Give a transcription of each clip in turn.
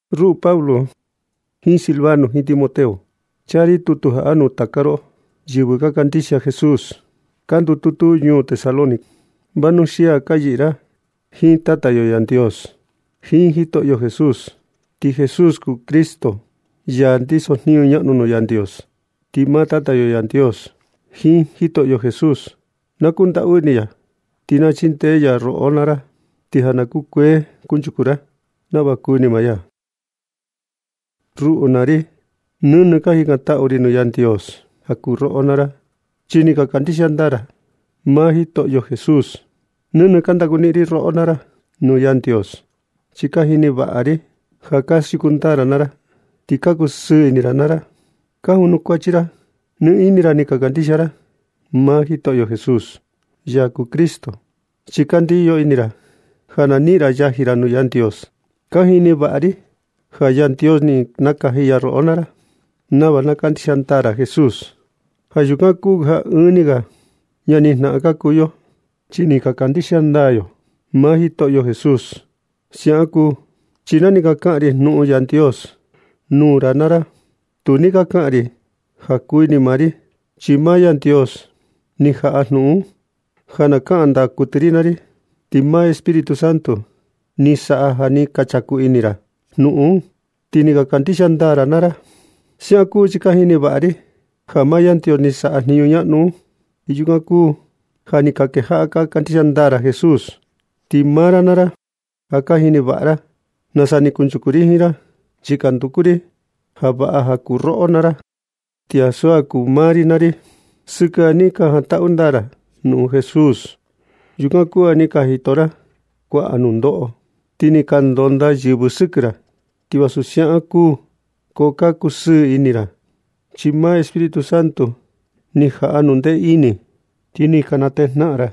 Ruꞌu Pablo jiin Silvano jiin Timoteo, chaa ri tutu jaꞌa nuu taka roꞌo, yɨvɨ ka kandixia Jesús ka ndututu ñuu Tesalónica, vanuxia ja ka yɨꞌɨ ra jiin Tata yo Yandios jiin Jitoꞌo Jesús. Ti Jesús kuu Cristo, ya ndiso jniñu ñaꞌnu nuu Yandios. Ti maa Tata yo Yandios jiin Jitoꞌo Jesús, na kundaꞌu ini ya ti na chindee ya roꞌo naa ra, ti ja na kukuee kunchuku ra nava kuni maa ya. Ruꞌu naa ri, nɨnɨ ka jikantaꞌu ri nuu Yandios ja kuu roꞌo naa ra, chi ni ka kandixia ndaa ra maa Jitoꞌo Jesús. Nɨnɨ ka ndaku niꞌin ri roꞌo naa ra nuu Yandios, chi ka jini vaꞌa ri ja ka siuku ndaa ra naa ra. Ti ka kusɨɨ ini ra naa ra, ka janukuachi ra, chi nɨ ini ra ni ka kandixia ra maa Jitoꞌo Jesús, ya kuu Cristo, chi ka ndiyo ini ra ja na niꞌin ra yaji ra nuu Yandios. Ka jini vaꞌa ri ja Yandios ni nakaji ya roꞌo naa ra nava na kandixia ndaa ra Jesús. Ja yukan kuu ja ɨɨn ni ga ñani jnaꞌan ka kuu yo, chi ni ka kandixia ndaa yo maa Jitoꞌo Jesús. Siaꞌan kuu chi na ni ka kaꞌan ri jnuꞌun Yandios nuu ra naa ra, tu ni ka kaꞌan ri ja kuu ini maa ri, chi maa Yandios ni jaꞌa jnuꞌun un ja na kaꞌan ndaa kuɨtɨ ri naa ri, ti maa Espíritu Santo ni saꞌa ja ni ka chaku ini ra jnuꞌun un, ti ni ka kandixia ndaa ra naa ra. Siaꞌan kuu chi ka jini vaꞌa ri ja maa Yandios ni saꞌa jniñu ñaꞌnu un, ti yukan kuu ja ni ka kejaꞌa ka kandixia ndaa ra Jesús. Ti maa ra naa ra, ja ka jini vaꞌa ra nasa ni kunchuku ri jiin ra. Chi ka nduku ri ja vaꞌa ja kuu roꞌo naa ra ti ansu ja kuu maa ri naa ri. Sɨkɨ ja ni ka jantaꞌu ndaa ra jnuꞌun Jesús, yukan kuu ja ni ka jito ra kuaꞌa nundoꞌo. Ni ka ndonda yɨvɨ sɨkɨ ra naa ra. Ti vasu siaꞌan kuu, ko ka kusɨɨ ini ra, chi maa Espíritu Santo ni jaꞌa jnundee ini, ti ni ka natejnaꞌan ra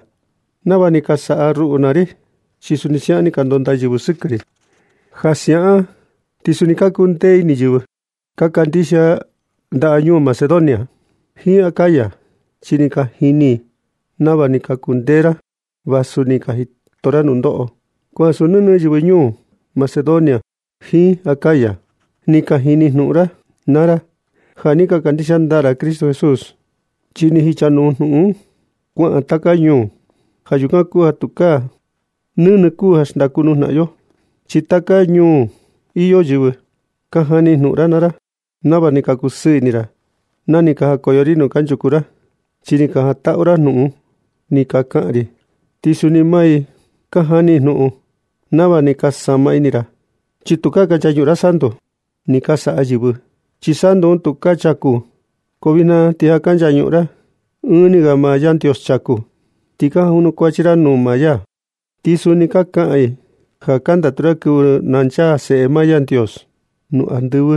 nava ni ka saꞌa ruꞌu naa ri, chi suni siaꞌan ni ka ndonda yɨvɨ sɨkɨ ri. Ja siaꞌan ti suni ni ka kuu ndee ini yɨvɨ ka kandixia ndañuu Macedonia jiin Acaya, chi ni ka jini i nava ni ka kundee ra vasu ni ka jito ra nundoꞌo. Ko ansu nɨnɨ yɨvɨ ndañuu Macedonia jiin Acaya ni ka jini jnuꞌun ra naa ra ja ni ka kandixia ndaa ra Jitoꞌo Jesús, chi ni jichanuu jnuꞌun un kuaꞌan taka ñuu. Ja yukan kuu ja tukaa nɨnɨ kuu ja xndaku nuu jnaꞌan yo, chi taka ñuu iyo yɨvɨ ka jani jnuꞌun ra naa ra nava ni ka kusɨɨ ini ra na ni ka jakoyo ri nuu kanchuku ra, chi ni ka jantaꞌu ra jnuꞌun ni ka kaꞌan ri. Ti suni maa i ka jani i jnuꞌun nava ni ka sama ini ra, chi tukaa ka nchañuꞌun ra santu ni ka saꞌa yɨvɨ, chi santu un tu ka chaku. Ko vijna ti ja ka nchañuꞌun ra ɨɨn ni ga maa Yandios chaku, ti ka janukuachi ra nuu maa ya. Ti suni ka kaꞌan i ja ka ndatu ra kɨvɨ nchaa maa Seꞌe Yandios nuu andɨvɨ,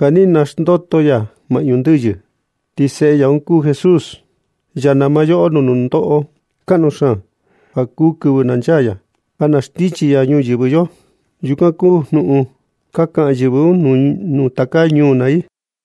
ja ni naxndoto ya maꞌñu ndɨyɨ. Ti Seꞌe ya un kuu Jesús, ya nama yoꞌo nuu nundoꞌo kaꞌnu xaan ja kuu kɨvɨ na nchaa ya, ja na xndichi ya ñuyɨvɨ yo. Yukan kuu jnuꞌun ka kaꞌa yɨvɨ un taka ñuu naa i.